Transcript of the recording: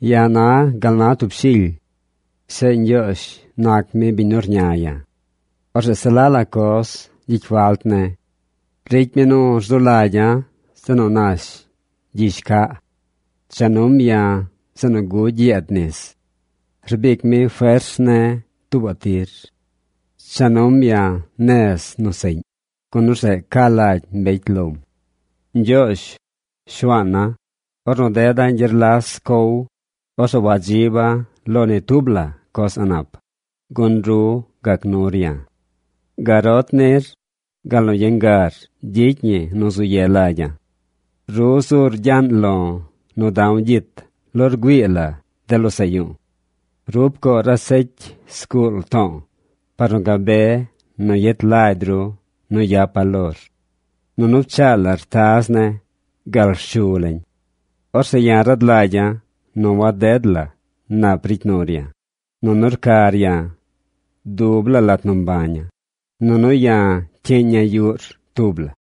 Ya̱ na gal na tub shily. Zeꞌ Ñgyoozh nac mi biñ nu rña ya̱. Orzeꞌ se la la coz gyicy falt ne̱. Ricy mi nu rzu lagya̱ zeꞌ nu nash gyizh caꞌ. Cha num ya̱ zeꞌ nu gugy yeed nis. Rbic mi fers ne̱ tuubaꞌ tir. Cha num ya̱ nez nu seꞌñ, gun orzeꞌ ca lagy mbecy lom. Ñgyoozh, Shuaana̱, ornu deda̱ gyerlas cow, orzeꞌ wadziba̱ lo ni tub la coz a̱ꞌ nap, gun ru gac nur ya̱. Garot nir, gal nu yangar gyicy ñi nu zu ye lagya̱. Ru zur gyaꞌn lo̱ nu da̱w gyit lo rgüii la de losaꞌ yu̱u̱. Ru pcoor asecy zguul to̱o̱ par nu gabe nu yet lagy ru nu yapa̱ lor. Nunu pchaa lar taz ne̱ gal rshu lañ. Orzeꞌ ya̱ rad lagya̱ nu waded la nap ricy nur ya̱, nunu rcar ya̱ dub laa lat nu mbaña̱, nunu ya̱ cyiiña̱ yuꞌr tub la.